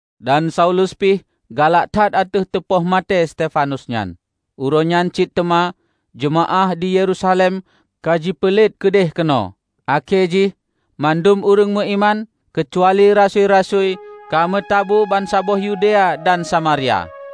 Dan Saulus pih galak that ateueh teupoh maté Stefanus nyan. Uroe nyan cit teuma jeumaáh di Yerusalem ka jipeulet keudeh keunoe, akhé jih mandum ureuëng meuiman, keucuali rasui-rasui, ka meutabu bansaboh Yudea dan Samaria.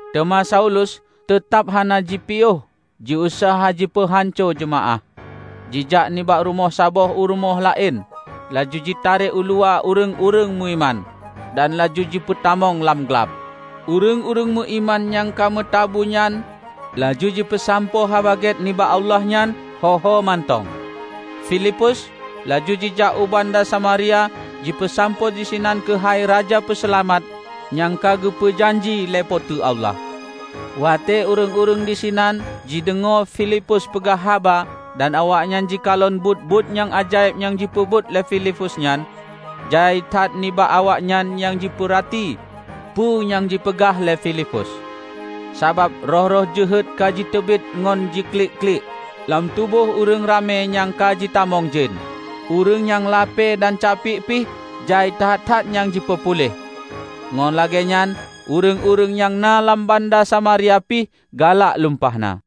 Teuma Saulus teutab hana jipiôh jiuseuha jipeuhanco jeumaáh. Jijak nibak rumoh saboh u rumoh laén laju jitarek uluwa ureuëng-ureuëng meuiman, dan laju jipeutamong lam glab. Ureuëng-ureuëng meuiman nyang ka meutabu nyan laju jipeusampoe Haba Gét nibak Allah nyan ho-ho mantong. Filipus laju jijak u banda Samaria jipeusampoe disinan keuhai Raja Peuseulamat nyang ka geupeu janji lé Po teu Allah. Watée ureuëng-ureuëng disinan jideungoe Filipus peugah haba dan awaknyan jikalon buet-buet nyang ajaéb nyang jipeubuet lé Filipus nyan, jai that nibak awaknyan nyang jipeurati peue nyang jipeugah lé Filipus. Sabab roh-roh jeuhet ka jiteubiet ngon jiklik-klik lam tuboh ureuëng ramé nyang ka jitamong jén. Ureuëng nyang lapée dan capiek pih jai that-that nyang jipeupuléh. Ngon lagée nyan ureuëng-ureuëng nyang na lam banda Samaria pih galak lumpah na.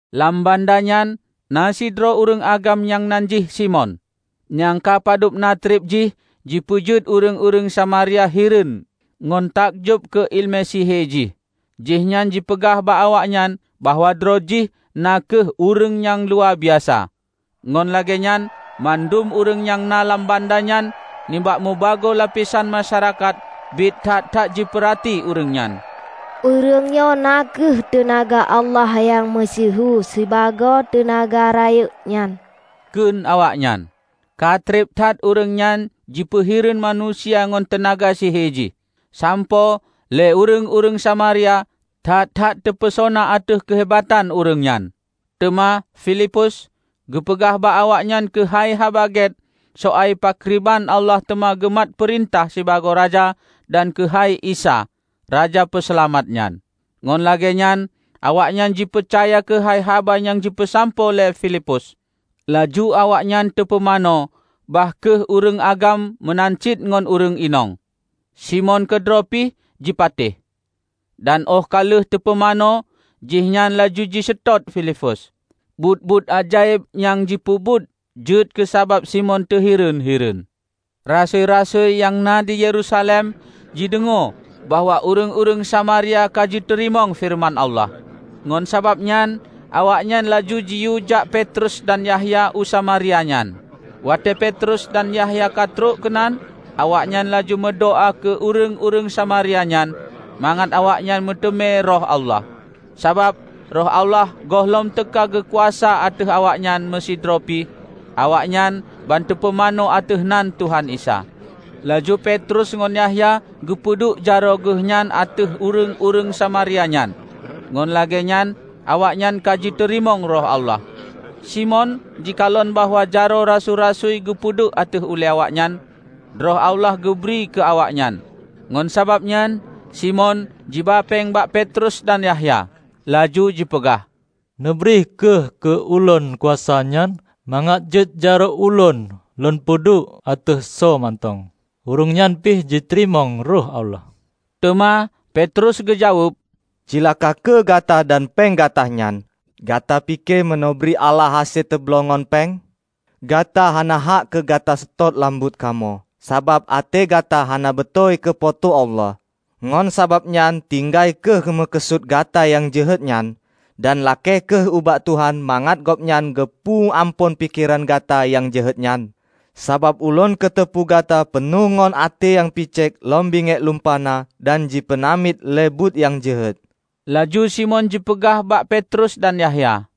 Lam banda nyan na sidroe ureuëng agam nyan nan jih Simon, nyang ka padub na treb jih jipeujeuet ureuëng-ureuëng Samaria hireuen ngon takjob keu iéleumé sihe jih. Jihnyan jipeugah bak awaknyan bahwa droe jih na kheueh ureuëng nyang luwabiasa. Ngon lagée nyan mandum ureuëng nyang na lam banda nyan nibak meubagoe lapesan masyarakat biet that-that jipeurati ureuëng nyan. "Ureuëng nyoe na kheueh teunaga Allah nyang meusyeuhu sibagoe 'Teunaga Rayeuk' nyan," kheun awaknyan. Ka treb that ureuëng nyan jipeuhireuen manusia ngon teunaga sihe jih, sampoe lé ureuëng-ureuëng Samaria that-that teupeusona ateueh keuhebatan ureuëng nyan. Teuma Filipus geupeugah bak awaknyan keuhai Haba Gét soai pakriban Allah teuma geumat peurintah sibagoe raja dan keuhai Isa, Raja Peuseulamat nyan. Ngon lagée nyan awaknyan jipeucaya keuhai haba nyang jipeusampoe lé Filipus, laju awaknyan teupeumanö bah kheueh ureuëng agam meunan cit ngon ureuëng inong. Simon keudroe pih jipatéh. Dan óh ka lheueh teupumanö, jihnyan laju jiseutôt Filipus. Buet-buet ajaéb nyang jipeubuet jeuet keu sabab Simon teuhireuen-hireuen. Rasui-rasui nyang na di Yerusalem jideungoe bahwa ureuëng-ureuëng Samaria ka jiteurimong feureuman Allah. Ngon sabab nyan awaknyan laju jiyue jak Petrus dan Yahya u Samaria nyan. Watée Petrus dan Yahya ka trok keunan, awaknyan laju meudoá keu ureuëng-ureuëng Samaria nyan mangat awaknyan meuteumé Roh Allah, sabab, Roh Allah gohlom teuka geukuasa ateueh awaknyan meusidroe pih; awaknyan ban teupumanö ateueh nan Tuhan Isa. Laju Petrus ngon Yahya geupeuduek jaroe geuhnyan ateueh ureuëng-ureuëng Samaria nyan; ngon lagée nyan awaknyan ka jiteurimong Roh Allah. Simon jikalon bahwa jaroe rasui-rasui geupeuduek ateueh awaknyan, Roh Allah geubri keu awaknyan. Ngon sabab nyan Simon jiba péng bak Petrus dan Yahya, laju jipeugah, "Neubri kheueh keu ulôn kuasa nyan mangat jeuet jaroe ulôn lôn peuduek ateueh soe mantong, ureuëng nyan pih jiteurimong Roh Allah." Teuma Petrus geujaweueb, "Ceulaka kheueh gata dan péng gata nyan! Gata pike meuneubri Allah hase teubloe ngon péng? Gata hana hak keu gata seutôt lam buet kamoe, sabab até gata hana beutôi keu Po teu Allah. Ngon sabab nyan tinggai kheueh meukeusut gata nyang jeuhet nyan, dan lakée kheueh ubak Tuhan mangat Gobnyan geupeu amphon pikeran gata nyang jeuhet nyan! Sabab ulôn kuteupeue gata peunoh ngon até nyang picék lom bingiek lumpah na dan jipeunamiet lé buet nyang jeuhet." Laju Simon jipeugah bak Petrus dan Yahya,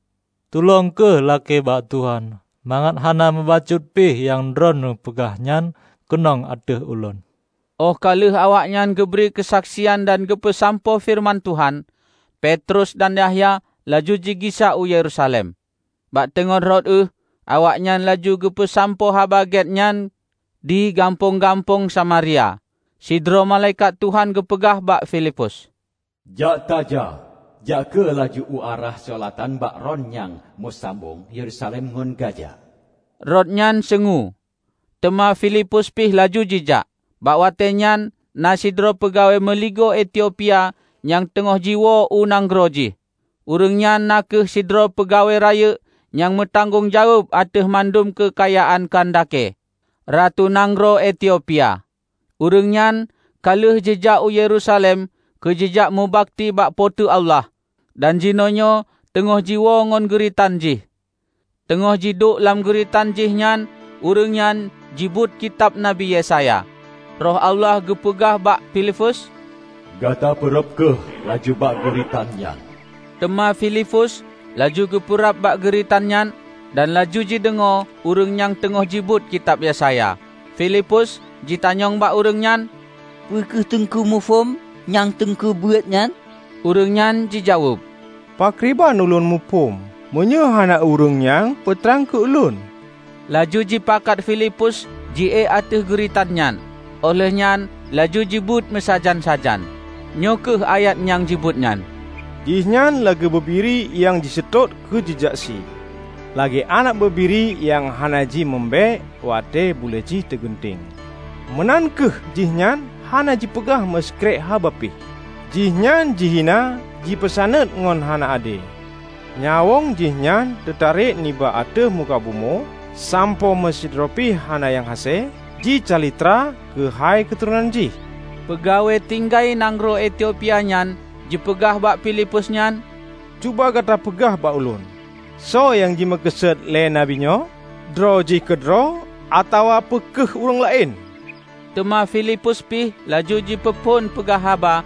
"Tulông kheueh lakée bak Tuhan mangat hana meubacut pih nyang droeneueh peugah nyan keunong ateueh ulôn." Óh ka lheueh awaknyan geubri keusaksian dan geupeusampoe feureuman Tuhan, Petrus dan Yahya laju jigisa u Yerusalem. Bak teungoh rot ueh, awaknyan laju jipeusampoe Haba Gét nyan di gampông-gampông Samaria. Sidroe malaikat Tuhan geupeugah bak Filipus, "Jak tajak! Jak kheueh laju u arah seulatan bak rot nyang meusambong Yerusalem ngon Gaza." Rot nyan seungue. Teuma Filipus pih laju jijak. Bak watée nyan na sidroe peugawée meuligoe Etiopia nyang teungoh jiwoe u nanggroe jih. Ureuëng nyan na kheueh sidroe peugawée rayeuk nyang meutanggong jaweueb ateueh mandum keukayaan Kandake, ratu nanggroe Etiopia. Ureuëng nyan ka lheueh jijak u Yerusalem keu jijak meubakti bak Po teu Allah dan jinoenyoe teungoh jiwoe ngon geuritan jih. Teungoh jiduek lam geuritan jih nyan ureuëng nyan jibeuet Kitab Nabi Yesaya. Roh Allah geupeugah bak Filipus, "Gata peurab kheueh laju bak geuritan nyan." Teuma Filipus laju geupeurab bak geuritan nyan, dan laju jideungoe ureuëng nyang teungoh jibeuet Kitab Yesaya. Filipus jitanyong bak ureuëng nyan, "Peu kheueh Teungku muphom nyang teungku beuet nyan?" Ureuëng nyan jijaweueb, "Pakriban ulôn muphom, meunyoe hana ureuëng nyang peutrang keu ulôn?" Laju jipakat Filipus jiek ateueh geuritan nyan óh lheueh nyan laju jibeuet meusajan-sajan. Nyoe kheueh ayat nyang jibeuet nyan, "Jihnyan lagée bubiri nyang jiseutôt keu jijak sie, lagée aneuëk bubiri nyang hana ji meu mbéek watée bulée jih teugunteng, meunan kheueh jihnyan hana jipeugah meusikrek haba pih. Jihnyan jihina jipeusaneut ngon hana ade. Nyawöng jihnyan teutarek nibak ateueh muka bumoe sampoe meusidroe pih hana nyang hase jicalitra keuhai keuturonan Jih." Peugawée tinggai nanggroe Etiopia nyan jipeugah bak Filipus nyan, "Cuba gata peugah bak ulôn, soe nyang jimeukeusut lé Nabi nyoe? Droe jih keudroe atawa peu kheueh ureuëng laén?" Teuma Filipus pih laju jipeuphon peugah haba;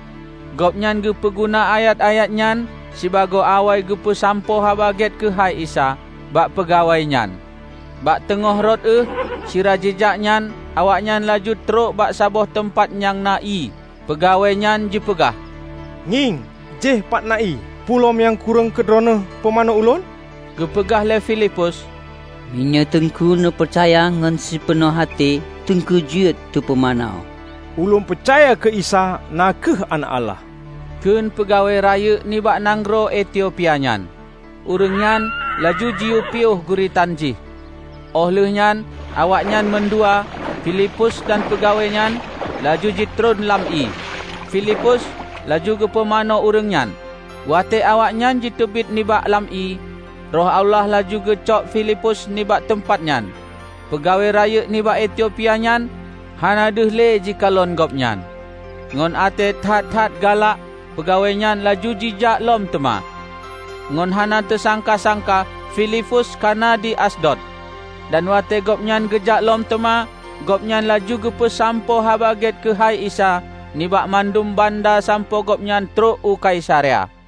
gobnyan geupeu guna ayat-ayat nyan sibagoe awai geupeusampoe Haba Gét keuhai Isa bak peugawée nyan. Bak teungoh rot ueh sira jijak nyan, awaknyan laju trok bak saboh teumpat nyang na ié. Peugawée nyan jipeugah, "Ngieng, jéh pat na ié! Peue lom nyang kureueng keu droeneueh pumanö ulôn?" Geupeugah lé Filipus, "Meunyoe Teungku neupeucaya ngon sipeunoh até, Teungku jeuet teupumanö." "Ulôn peucaya keu Isa na kheueh Aneuëk Allah," kheun peugawée rayeuk nibak nanggroe Etiopia nyan. Ureuëng nyan laju jiyue piôh geuritan jih; óh lheueh nyan awaknyan mandua, Filipus dan peugawée nyan, laju jitron lam ié, Filipus laju geupumanö ureuëng nyan. Watée awaknyan jiteubiet nibak lam ié, Roh Allah laju geucok Filipus nibak teumpat nyan. Peugawée rayeuk nibak Etiopia nyan hana deuh le jikalon gobnyan. Ngon até that-that galak peugawée nyan laju jijak lom teuma. Ngon hana teusangka-sangka Filipus ka na di Asdod, dan watée gobnyan geujak lom teuma, gobnyan laju geupeusampoe Haba Gét keuhai Isa nibak mandum banda sampoe gobnyan trok u Kaisarea.